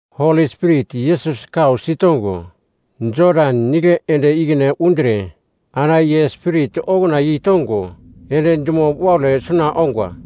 Holi Spirit Yesus kau sitongo, Jodan Nigle ende ikine undre ana ye Spirit okuna yeitongo, ende dumo waule suna ongwa.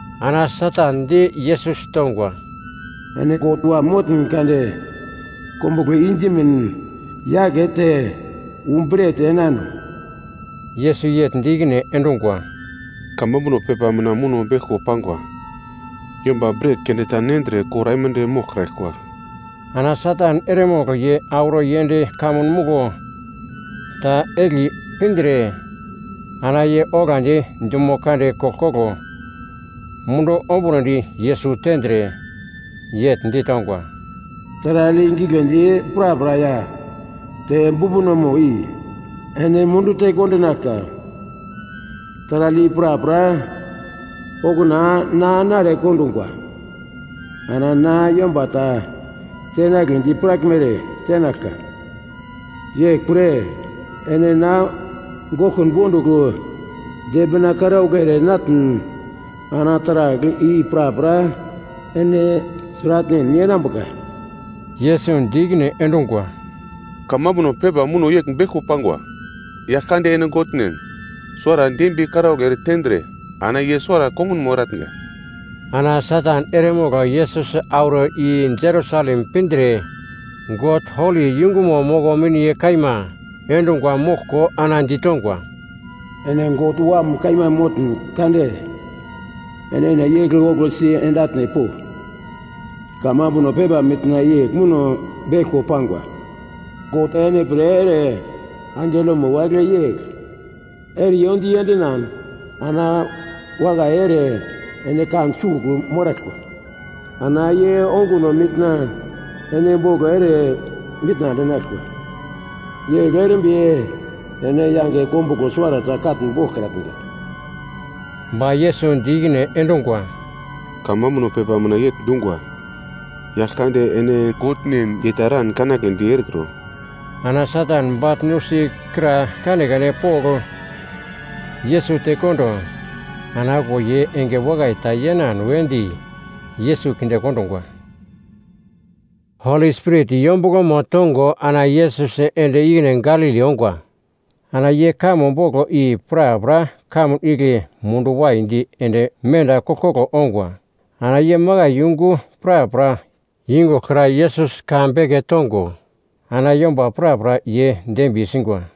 Ana Satan di Yesus tongwa, “Ene God Wam motn kade kombuglo i dimin yakete wu bret enano.” Yesus yegl di ikine endungwa, “Kamambuno pepa mina muno beglko pangwa, ‘Yomba bret keunde ta nendre kor aimande moglkraglkwa.’” Ana Satan eremogl ye auro yend kamun muglo ta egli pindre ana ye oglandi dumo kande koglkoglo mundu ombunodi Yesus tendre, yegl ditongwa, “Taragl i gigledi prapra ya bumbunomo i ene mundu tekondinaglka, taragl i prapra okuna na nare kondungwa. Ana na yomba ta tenagledi piraglmere tenaglka. Yeglpre ene na goglkun bondugl dembina karaugl ere natn ana taragl i prapra ene sratnen yenambuka.” Yesus di ikine endungwa, “Kamambuno pepa muno yegl beglko pangwa, ‘Yaglkande ene Godnen suwara dembiye karaugl ere tendre ana ye suwara kongunmo eratnga.’” Ana Satan eremogl Yesus auro i Jerusalem pindre God holi yungumo moko miniye kaima endungwa moglko ana ditongwa, “Ene God Wam kaima motn kade enene igle oglosi ende atne po. Kamambuno pepa mina yegl muno beglko pangwa, “‘God ene pre ere angelomo wagle yegl eriyo di endinan, ana wakai ere ene kan sugl moraglkwa. Ana ye onguno mina ene boglo ere mitna endinaglkwa. Yegl erimbi ene yange kombuglo suwarata katn boglkrambuka.’” Ba Yesus di ikine endungwa, “Kamambuno pepa mina yegl dungwa, ‘Yaglkande ene Godnen ye ta eran kanagledi erekro.’” Ana Satan bagl nusi kra kanekane pogl Yesus tekondo ana okuwo ye enge wakai ta yenan wedi Yesus kinde kondungwa. Holi Spirit yombuglomo tongo ana Yesus ende ikine Galili ongwa. Ana ye kamo boglo i prapra kamun igle mundu waidi ende menda koglkoglo ongwa. Ana ye makai yungu prapra yungugl kra Yesus ka beke tongo ana yomba prapra ye dembiye singwa.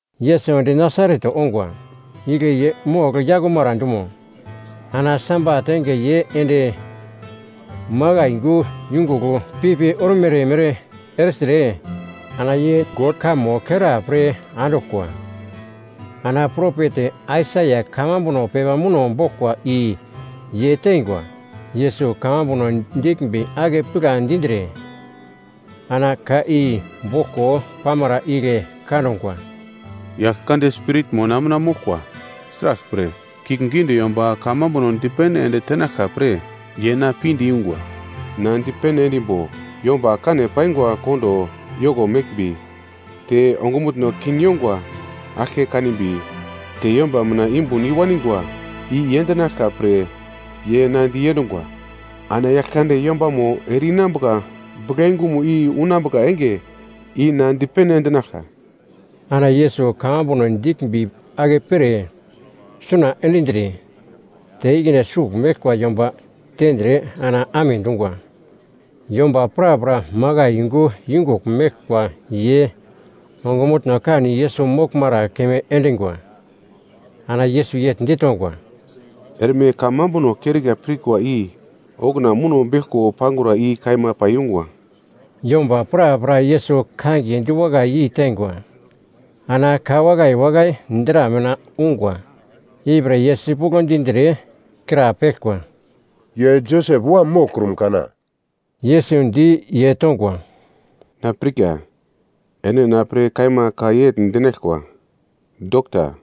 Yesus ende Nasaret ongwa, igle ye mogl yakumara dumo. Ana Sabat enge ye ende makai yungu yungugl pipi ormere mere ertre ana ye God kamo kera pre anduglkwa. Ana propet Aisaia kamambuno pepa muno boglkwa i ye teingwa. Yesus kamambuno diglmbi ake pigla dindre, ana ka i boglko pamara igle kangwa, “Yaglkande Spiritmo na mina moglkwa. Sraglpre, kiuglgiunde yomba kamambuno dipene ende tenaglka pre ye na pinde yungwa. Na dipene endimbo yomba kane paingwa kondo yoko meglmbi, te ongumutno kin yongwa aglke kanimbi, te yomba mina yumbun i waningwa i yendinaglka pre ye na diendungwa. Ana Yaglkande yombamo ere-inambuka buglayungumo i unambuka enge i na dipene endinaglka.” Ana Yesus kamambuno diglmbi akepere suna endindre, te ikine sugl meglkwa yomba tendre ana amedungwa. Yomba prapra makai yungu yungugl meglkwa ye ongumutno kan Yesus moglmara keunde endingwa. Ana Yesus yegl ditongwa, “Erme kamambuno kerika pirkwa i okuna muno beglko pangura i kaima paiyungwa.” Yomba prapra Yesus kangiye diwakai yeitengwa. Ana ka wakai wakai dra mina ungwa ipre ye sipuglo dindre, krapeglkwa, “Ye Josep wam moglkrum kana.” Yesus di ye tongwa, “Na pirka ene na pre kaima ka yegl dinaglkwa, ‘Dokta,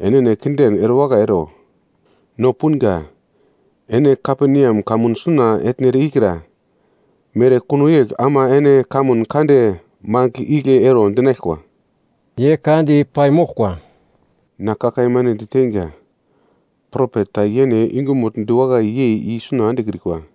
enene kinden erewakai ero! No punga ene Kaperneam kamun suna etnere ikra mere kuno yegl ama enene kamun kande mangigl igle ero dinaglkwa.’” Ye ka di paimoglkwa, “Na ka kaima ene diteinga, propet ta yene yungumugl diwakai yei i suna endekrikwa.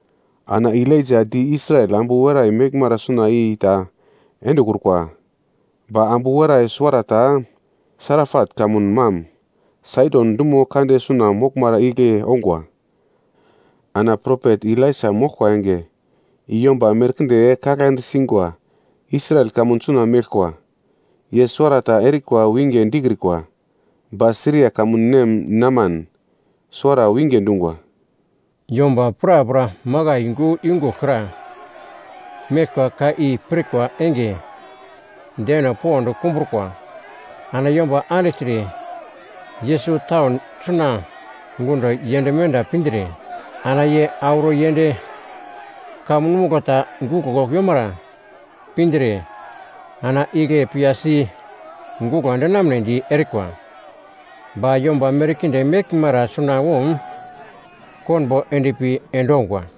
Ana Elaija di Israel ambu werai meglmara suna i ta endekrukwa. Ba ambu werai suwarata Sarapat kamun mam Saidon dumo kande suna moglmara igle ongwa. Ana propet Elaisa moglkwa enge i yomba merkinde kaglande singwa Israel kamun suna meglkwa. Ye suwarata erikwa winge dikrikwa, ba Siria kamun nem Neman suwara winge dungwa.” Yomba prapra makai yungu yungugl kra meglkwa ka i pirkwa enge deno pond kumbrukwa. Ana yomba andigltre, Yesus taun suna gundo yend menda pindre ana ye auro yend kamun muglo ta guglo yomara pindre, ana igle piyasi guglo endinamnedi erikwa, ba yomba merkinde meglmara sunawom konbo endpi endongwa.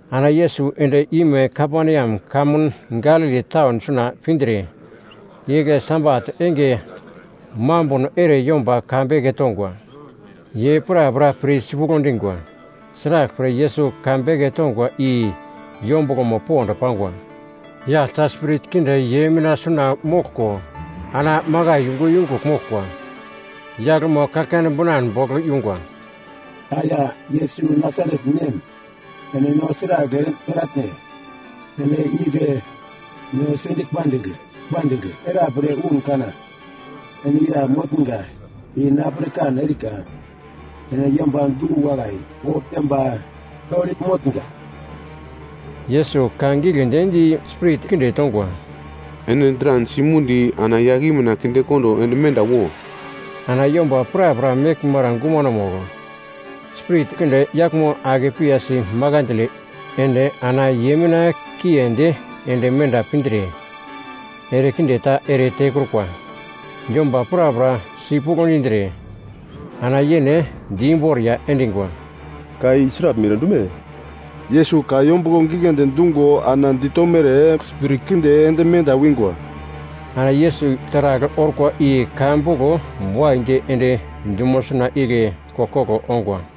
Ana Yesus end-ime Kaperneam kamun Galili taun suna pindre, igle Sabat enge mambuno ere yomba ka beke tongwa. Ye prapra pir sipuglo dingwa, sraglpre Yesus ka beke tongwa i yombuglomo pond pangwa. Yagl ta spirit kinde ye mina suna moglko ana makai yungu yungugl moglkwa. Yaglmo kaglkane binan bogl yungwa. “Aya Yesus Nasaret nem, ene no sragl ere noratn? Ene igle no si pindigl pandigl era pre un kana? Ene ira motnga i na pirkan erika. Ene yomba du-wakai, God yomba holi motnga.” Yesus ka giglendi di spirit kinde tongwa, “Ene dran simundo ana yagl i mina kindekondo ende menda wo.” Ana yomba prapra meglmara gumanomugl spirit kinde yaglmo ake piyasi makandle ende ana ye mina kiendi ende menda pindre ere kinde ta ere tekrukwa. Yomba prapra sipuglo dindre, ana yene di imboriya endingwa, “Ka i sraglmere dume? Yesus ka yombuglo gigledi dungo ana ditomere spirit kinde ende menda wingwa.” Ana Yesus taragl orkwa i ka boglo waidi ende dumo suna igle koglkoglo ongwa.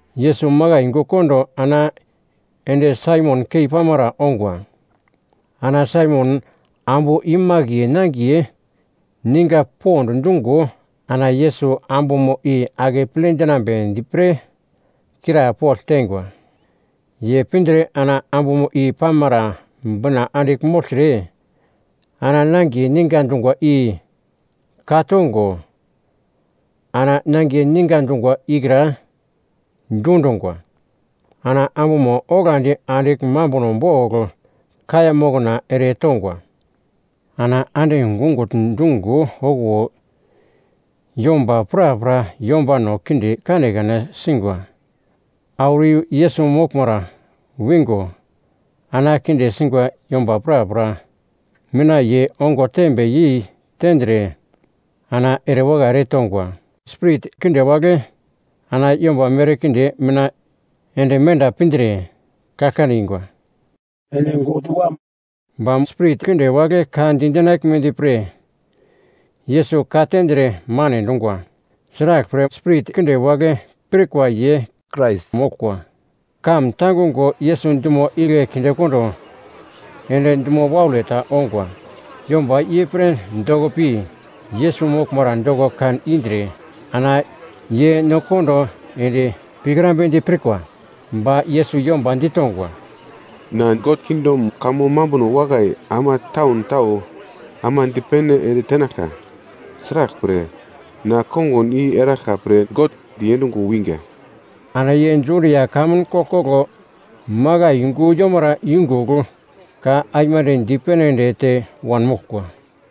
Yesus makai yungu kondo ana ende Saimon keipamara ongwa. Ana Saimon ambu imakiye nangiye ninga pond dungo ana Yesus ambumo i akeple dinambedi pre krapogl teingwa. Ye pindre ana ambumo i pamara bina andigl mogltre, ana nangiye ninga dungwa i ka tongo, ana nangiye ninga dungwa ikra dundungwa. Ana ambumo oglandi andigl mambuno bogl kaiya moknano ere tongwa. Ana ande gungugl dungo okuwo yomba prapra yombano kinde kanekane singwa auro i Yesus moglmara wingo ana kinde singwa yomba prapra mina ye ongo tembe yei tendre ana erewakai eretongwa. Spirit kinde wagle ana yomba merkinde mina ende menda pindre, kaglkane ingwa, “Ene God Wam!” Ba spirit kinde wagle ka di dinaglmedi pre Yesus ka tendre mane dungwa. Sraglpre spirit kinde wagle pirkwa ye Krais moglkwa. Kamun tangungo Yesus dumo igle kindekondo ende dumo waule ta ongwa. Yomba ye pre doko pi, Yesus moglmara doko kan indre ana ye no kondo ende pikrambedi pirkwa. Ba Yesus yomba ditongwa, “Na God kingdom kamo mambuno wakai ama taun tau ama dipene ende tenaglka. Sraglpre, na kongun i eraglka pre God diendungo winga.” Ana ye Judia kamun koglkoglo makai yungu yomara yungugl ka aimande dipene ende te wanmoglkwa.